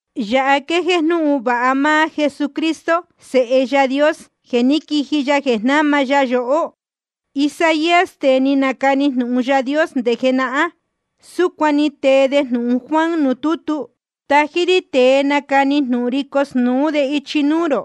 Yāha quéjéé jnúhun vāha máá Jesucristo Sēhe Yaā Dios, jeē ní quiji ya jeē jnama ya yohó. Isaías, tēe ni nacani jnūhun Yaā Dios nde jenahán, súcuan ni tee de jnūhun Juan nuū tútu: Tají rí tēe nacani jnūhun ri cosnūú de ichi núú rō,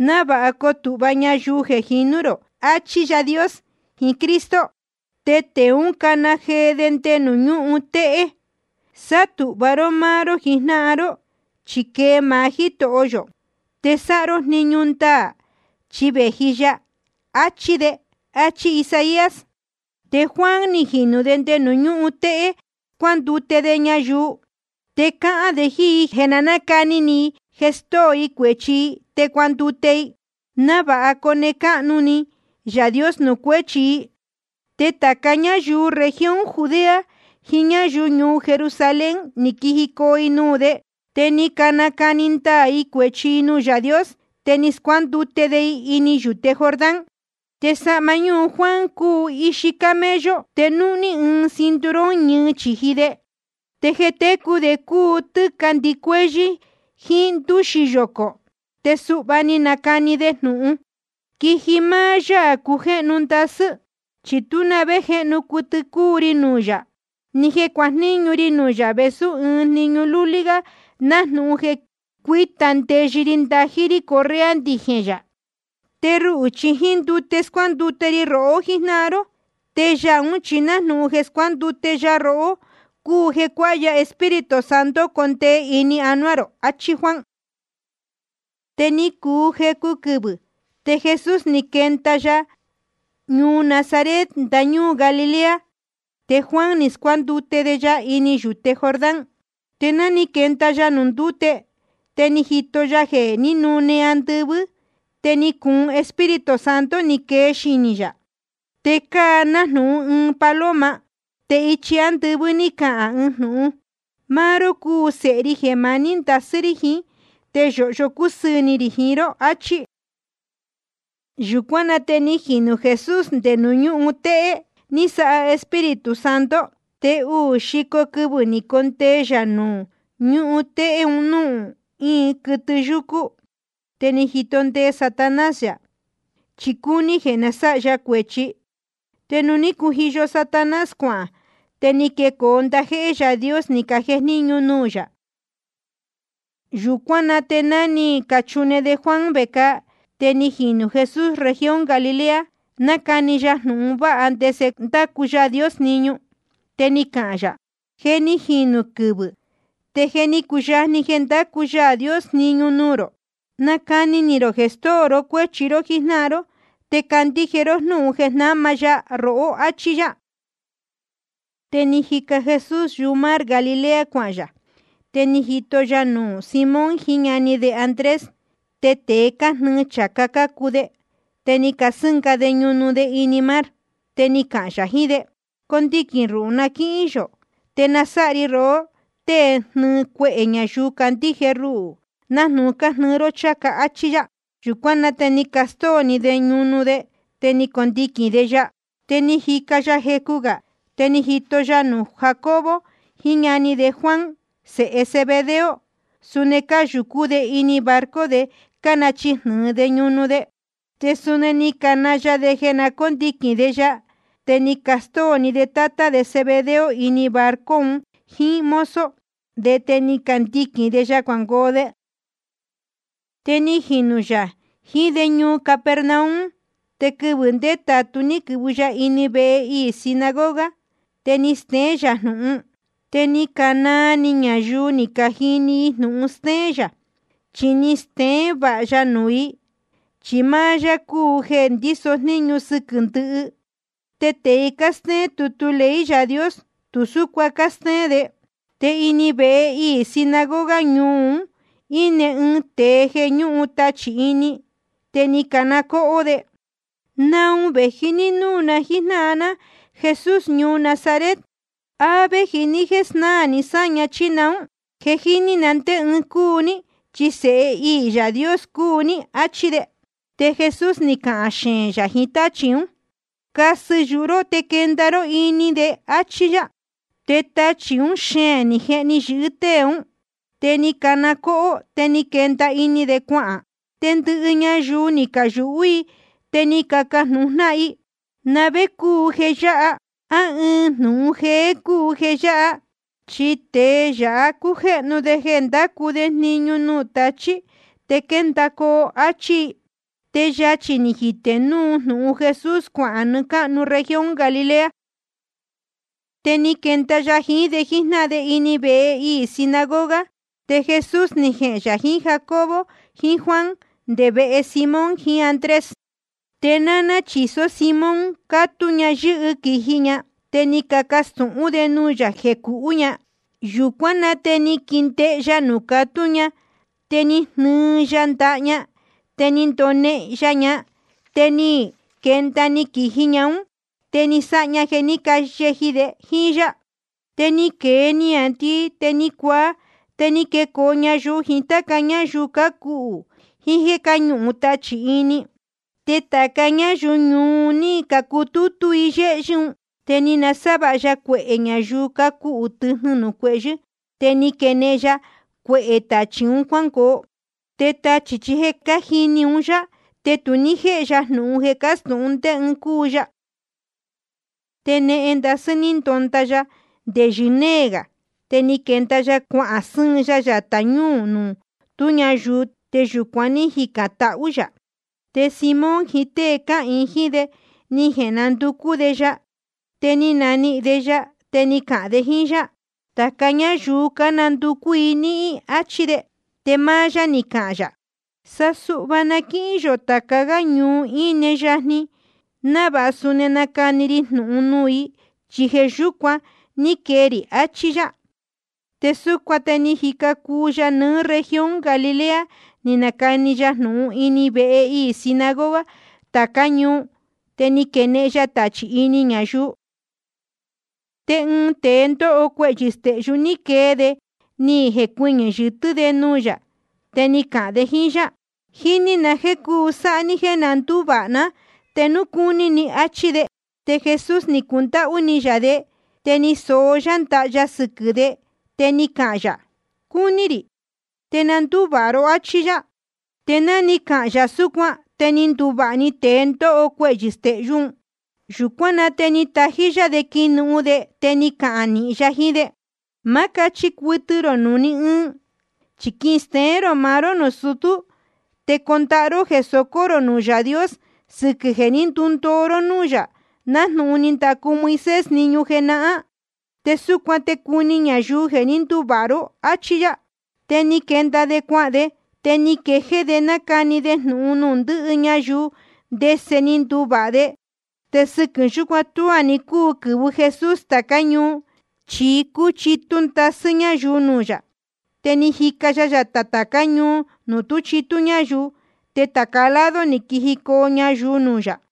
návāha coo tūhva ñayuu jeē jinú rō, achí Yaā Dios jiín Cristo. Te tēe ún cana jee de nde nuū ñúhun téhé: Sátūhva ró máá ró jijnáhan ró, chi quee maá Jítoho yō. Te sáha ró jniñu ndaā, chi vēji ya, achi de. Achí Isaías. Te Juan ni jinū de nde nuū ñúhun téhé, scuándute de ñayuu. Te cáhán de jíín i jeē na nácani ni i jeē stóo i cuēchi i te cuandute i, návāha cone cáhnu ni Yaā Dios nuū cuéchi i. Te tāca ñáyuu región Judea jiín ñáyuu ñuu Jerusalén, ni quijicoo i nuū de. Te ni canacani ndaā i cuēchi i nuū Yaā Dios, te ni scuándute de i ini yūte Jordán. Te sahma ñúhun Juan cúu ixi camello, te núhní ɨɨn cinturón ñɨɨ chīji de. Te jeē técu de cúu tɨ́ca ndɨcuéhyɨ́ jíín ndúxi yocō. Te suhva ni nacani de jnūhun: Quiji máá Yaā cujéhnu ndasɨ́. Chi tú na vé jéhnu cuɨtɨ cúu ri nuū yā, ni jeē cuajníñu ri nuū yā vēsú ɨɨn jniñu lúlí gá nájnūhun jeē cuíta ndeyɨ ri ndají rí correa ndijēn yā. Te ruhū chi jíín ndute scuándute ri rohó jíjnáhan ró, te Yaā ún chi nájnūhun jeē scuándute ya rohó cúu jeē cuáha ya Espíritu Santo condee ini anuá rō, achí Juan. Te ni cuu jecu quɨvɨ̄, te Jesús ni quenda ya ñuu Nazaret ndañúū Galilea, te Juan ni scuándute de ya ini yūte Jordán. Te ná ni quenda ya nuū ndúte, te ni jito ya jeē ní nune‑ni andɨvɨ́, te ni cuun Espíritu Santo ni quee xinī yā, te cáa nájnūhun ɨɨn paloma. Te ichi ándɨvɨ́ ní cahān ɨɨn jnūhun: Máá ró cúu Sēhe ri jeē maní ndasɨ́ rí jiín, te yōhyo cúsɨɨ̄ ni rī jiín ró, achí. Yūcuán na te ni jinū Jesús nde nuū ñúhun téhé ní sáha Espíritu Santo. Te uū xico quɨvɨ̄ ni condee yā nuū ñúhun téhé un núū íin quɨtɨ yúcú. Te ni jito ndee Satanás yā, chi cúní jeē sáha ya cuēchi. Te nuū ní cujiyo Satanás cuahān, te ni quecoo ndajéhé Yaā Dios, ni cajejníñu nuū yā. Yūcuán na te ná ni cachune de Juan vecāa, te ni jinū Jesús región Galilea, nácani ya jnūhun vāha ndese ndácu Yaā Dios jniñu. Te ni cahān yā: Je ni jinū quɨvɨ̄, te je ni cuyajni jeē ndácu Yaā Dios jniñu nuū rō. Nacani ni rō jeē stóo ró cuéchi ró jíjnáhan ró, te candíje ró jnúhun jeē jnáma ya rohó. Achí yá. Te jíca Jesús yumar Galilea cuahān yā. Te ni jito ya nuū Simón jiín ñani de Andrés. Te tēe cájnɨɨ chācá cácuu de, te cásɨ́nga de ñunu de ini mar. Te ni cahān yā jiín de: Condiquīn ruhū na quíhín yō, te nasáha ri rohó tée nihīn cuehē ñayuu candíje ruhū, nájnūhun cánihīn rō chācá, áchí yá. Yūcuán na te ni castóo‑ni de ñunu de, te ni candiquīn de ya. Te ni jica ya jecu gā, te ni jito ya nuū Jacobo jiín ñani de Juan, sēhe Zebedeo, suni cáyūcú de ini barco de, cánachijnɨ̄ɨ de ñunu de. Te suni ni cana ya de jeē cóndiquīn de ya. Te ni castóo‑ni de tátá de Zebedeo ini barco un jíín mozo de, te ni candiquīn de ya cuangoo de. Te ni jinū yā jiín de ñuu Capernaum. Te quɨvɨ̄ ndétātu ní quɨ̄vɨ ya ini vehe iī sinagoga, te ni steén yā jnūhun. Te ni canaa ni ñayuu ni cajini i jnūhun stéén yā. Chi ni steén vāha ya nuū i, chi máá yá cúu jeē ndíso jníñu sɨquɨ̄ ndɨhɨ. Te tēe cástéén tutu ley Yaā Dios, tu súcuan cástéén de. Te ini vehe iī sinagoga ñuu un íne ɨɨn tēe jeē ñúhun tachī ini. Te ni cana cóhó de: ¿Naun vēji ní núū na jíjnáhan ná, Jesús ñuu Nazaret? ¿A véji ní jéē snáā ni sáña, chí naún? Je jíní na ndé ɨɨn cúu ní, chi Sēhe iī Yaā Dios cúu ní. Achí de. Te Jesús ni cahān xeēn yā jiín táchī ún: Casɨ yuhu ró te quenda ró ini de, áchí yá. Te tachī ún xeēn ni jehni yɨ̄hɨ́ tée ún. Te ni cana cóhó, te ni quenda ini de cuahān. Te ndɨhɨ ñayuu ni cayūhú i, te cácajnūhun jnáhan i: ¿Na vé cúu jeē yáha? ¿A ɨɨn jnūhun jéé cúu jeē yáha? Chi tēe yáha cújéhnu de jeē ndácu de jniñu nde nuū tachī te quéndacoo, áchí i. Te yachī ni jitē núu jnūhun Jesús cuahān nɨɨ́ cáhnu región Galilea. Te ni quenda ya jiín de jíjnáhan de ini vehe iī sinagoga. Te Jesús ni jehēn yā jiín Jacobo jiín Juan nde vehe Simón jiín Andrés. Te náná chīsó Simón, cátú ña yɨ́hɨ quīji ña. Te ni cacastūhún de nuū yā jeē cuhú ña. Yūcuán na te ni quindehe ya nuū catú ña, te ni jnɨɨ ya ndaha ña, te ni ndonehen ya ña. Te ni quenda‑ni quīji ún ña, te ni sáha ña jeē ní cayeji de jíín yá. Te ni quēe niāndii te ni cuaa. Te ni quecoo ñayuu jiín táca ñáyuu cácuhū jiín jéē ñúhun tachī ini. Te tāca ñáyuu ñuu un ní cacutútú i yéhyɨ́ un. Te ni nasávāha ya cuehē ñayuu cácuhū tɨjnɨ nuū cuehyɨ́, te ni quenehen ya cuehē tachī un cuángoo. Te tachī chi je cájini un yá, te tu ní jéhe ya jnūhun jeē cástūhun ndé ɨɨn cúu ya. Te nehen ndasɨ́ ní ndonda ya, nde yɨ́nee gā. Te ni quenda ya cuahān sɨ́ɨn ya yatā ñúū nuū tú ñayuu, te yūcuan ní jicān tahú yā. Te Simón jiín tée cáhīin jíín de, ni jenanducú de ya. Te ni cananihīn de ya, te ni cacahān de jíín yá: Tāca ñáyuu cánanducú i níhín, áchí de. Te máá yá ni cahān yā: Sa suhva na quíhín yō tāca gá ñuu íne yajni, návāha suni nacani ri jnūhun nuū i, chi jeē yúcuan ní quee rī. Achí yá. Te súcuan te ni jica cuu ya nɨɨ́ región Galilea, ni nacani ya jnūhun ini vehe iī sinagoga tācá ñuu, te ni quenehen ya tachī ini ñayuu. Te ɨɨn tēe ndóho cuehyɨ̄ stehyú, ni quee de ni jecuɨñɨ̄ yɨtɨ́ de nuū yā, te ni cahān de jíín yá: Jíní na jeē cuu sáha ní jéē nduvāha ná, te núu cúní ni, áchí de. Te Jesús ni cundáhú ni yā de, te ni soó yá ndaha ya sɨquɨ̄ de, te ni cahān yā: Cúní rī. Te na ndúvāha ró, áchí yá. Te ná ni cahān yā súcuan, te ni nduvāha‑ni tēe ndóho cuehyɨ̄ stehyú un. Yūcuán na te nátají yá de quinuhun de, te ni cahān nīhin ya jiín de: Ma cáchi cuɨtɨ rō nuū ní ɨɨn. Chi quisteén rō maá ró nuū sutú, te condahá ró jeē socó rō nuū Yaā Dios sɨquɨ̄ jeē ndúndoo ró núū yā, nájnūhun ni ndacu Moisés jniñu jenahán. Te súcuan te cuni ñayuu jeē ní nduvāha ró. Achí yá. Te ni quenda de cuahān de, te ni quejéé de nácani de jnūhun nuū ndɨhɨ ñayuu ndese ni nduvāha de. Te sɨquɨ̄ yúcuan tuá ni cúu quɨ̄vɨ Jesús tācá ñuu, chi cúchitú ndasɨ́ ñáyuu nuū yā. Te ni jica ya yatā tācá ñuu nuū tu cúchitú ñáyuu. Te tāca lado ni quijicoo ñayuu nuū yā.